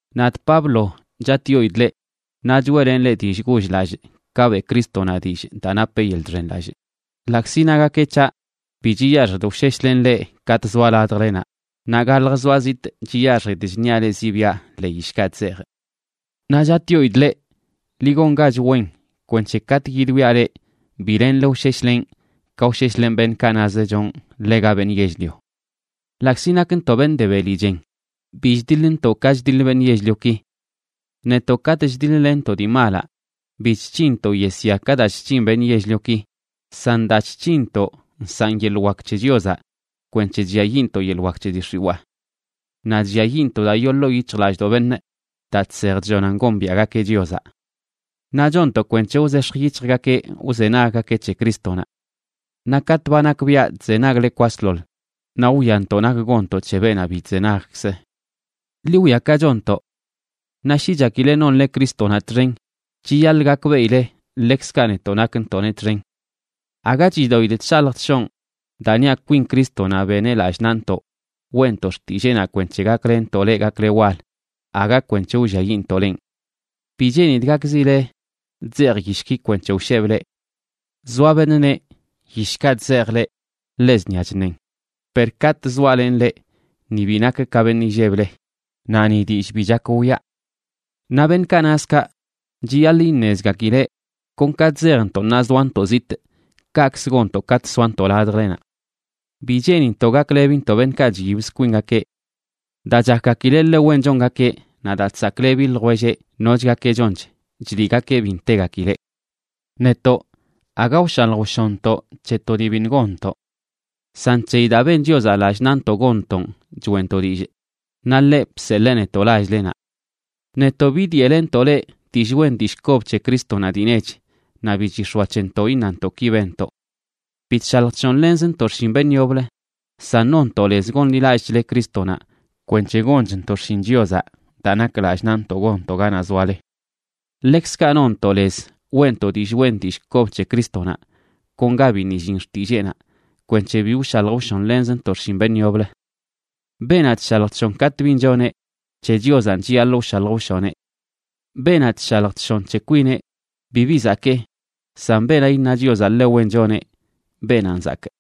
Nadꞌ Pablo, chatꞌyoidꞌ leꞌ, naꞌ choeꞌlenꞌ leꞌ dillꞌ goll-lallꞌ ka beꞌ Crístonaꞌ dillꞌ daa napeꞌ yeḻꞌ chxenlallꞌ, ḻaꞌkzi nagakeꞌ c̱haꞌ bi chiyaxjidꞌ wsheshlenꞌ leꞌ katꞌ zoaꞌ ladjlenaꞌ, naꞌ galjə zoaꞌ zitꞌ chiyaxjidꞌ chṉiaꞌ leꞌ ziꞌbiaꞌ ḻee yishkaꞌ chzejꞌ. Naꞌ chatꞌyoidꞌ leꞌ, ḻi gongach wen kwenc̱he katꞌ yidwiaꞌ leꞌ bi lenle wsheshlenꞌ ka wsheshlenꞌ beṉꞌkaꞌ naz chonꞌ ḻega beṉꞌ yell-lio. Ḻaꞌkzi nakntoꞌ beṉꞌ de beli chen, bi chdiḻntoꞌ ka chdiḻ beṉꞌ yell-lioki. Netoꞌ, katꞌ chdiḻ-lenntoꞌ dii malaꞌ bi chc̱hinntoꞌ yesya ka daa chc̱hin beṉꞌ yell-lioki, san daa chc̱hinntoꞌ nsaꞌn yeḻꞌ wak c̱he Chiozaꞌ kwenc̱he chlliayiꞌntoꞌ yeḻꞌ wak c̱he dii x̱iwaa. Naꞌ chlliayiꞌntoꞌ daa yoo ḻoo yic̱hjlallꞌdoꞌ beṉꞌ daa chsej chllonan gombiaꞌgakeꞌ Chiozaꞌ. Naꞌ chonntoꞌ kwenc̱he wzex̱j yic̱hjgakeꞌ wzenaggakeꞌ c̱he Crístonaꞌ. Naꞌ katꞌ ba nakbiaꞌ chzenagle kwasḻoḻ, naꞌ wwiantoꞌ nak gonntoꞌ c̱he beenaꞌ bi chzenagkz. Ḻi wwia ka chonntoꞌ. Naꞌ shi chakile nonle Crístonaꞌ txen, chiyaḻꞌ gakbeꞌile ḻekzkaꞌ netoꞌ nakntoꞌneꞌ txen. Aga chidoꞌidꞌ chshalj chshonꞌ daa niaꞌ kwin Crístonaꞌ beneꞌ lallꞌ naꞌntoꞌ weꞌntoꞌ xtilleenaꞌ kwenc̱he gaklenntoꞌ leꞌ gakle wal, aga kwenc̱he wlliayiꞌntoꞌ lenꞌ. Bi cheenidꞌ gakzile chzejꞌ yishki kwenc̱he wshebꞌ leꞌ. Zoa beṉꞌ neꞌ yishkaꞌ chzejꞌ leꞌ ḻe zṉia chṉen, per katꞌ zoalenꞌ leꞌ ni bi nakꞌ ka beṉꞌ illeble, naꞌ ni dillꞌ bi chak wiꞌa. Naꞌ beṉꞌkaꞌ naz kaꞌ, chiyaḻꞌ iṉezgakileꞌ kon ka chzejntoꞌ ṉaa zoantoꞌ zitꞌ, kaꞌkzə gonntoꞌ katꞌ soantoꞌ ladjlenaꞌ. Bi cheenintoꞌ gaklebintoꞌ beṉꞌkaꞌ chyibz kwingakeꞌ. Daa chakgakileꞌ ḻe wen chongakeꞌ naꞌ daa chsaklebi ljwelleꞌ nochgakeꞌ chonch, chliꞌgakeꞌ bi ntegakileꞌ. Netoꞌ, aga wshalj wshonntoꞌ c̱he to dii biṉꞌ gonntoꞌ. San c̱heyi daa ben Chiozaꞌ lallꞌ naꞌntoꞌ gonntoꞌn choeꞌntoꞌ dillꞌ, naꞌ ḻeꞌ bseḻee netoꞌ lall-lenaꞌ. Netoꞌ bidyeꞌlenntoꞌ leꞌ dillꞌ wen dillꞌ kob c̱he Crístonaꞌ dii nech, naꞌ bi chix̱oa c̱hentoꞌ iṉantoꞌ: “ki benntoꞌ”. Bi chshalj chshonlenzntoꞌ xshin beṉꞌ yoblə, san nonntoꞌ lez gonḻilallꞌchle Crístonaꞌ kwenc̱he gonchntoꞌ xshin Chiozaꞌ daa nak lallꞌ naꞌntoꞌ gonntoꞌ ganaꞌ zoale. Ḻekzkaꞌ nonntoꞌ lez weꞌntoꞌ dillꞌ wen dillꞌ kob c̱he Crístonaꞌ kon ga biṉꞌ illin xtilleenaꞌ, kwenc̱he bi wshalj wshonlenzntoꞌ xshin beṉꞌ yoblə. Beenaꞌ chshalj chshon katꞌ bin choneꞌ, c̱he Chiozanꞌ chiyaḻꞌ wshalj wshoneꞌ. Beenaꞌ chshalj chshon c̱he kwineꞌ, bibi zakee, san beenaꞌ iṉa Chiozaꞌ ḻe wen choneꞌ, beenanꞌ zakꞌ.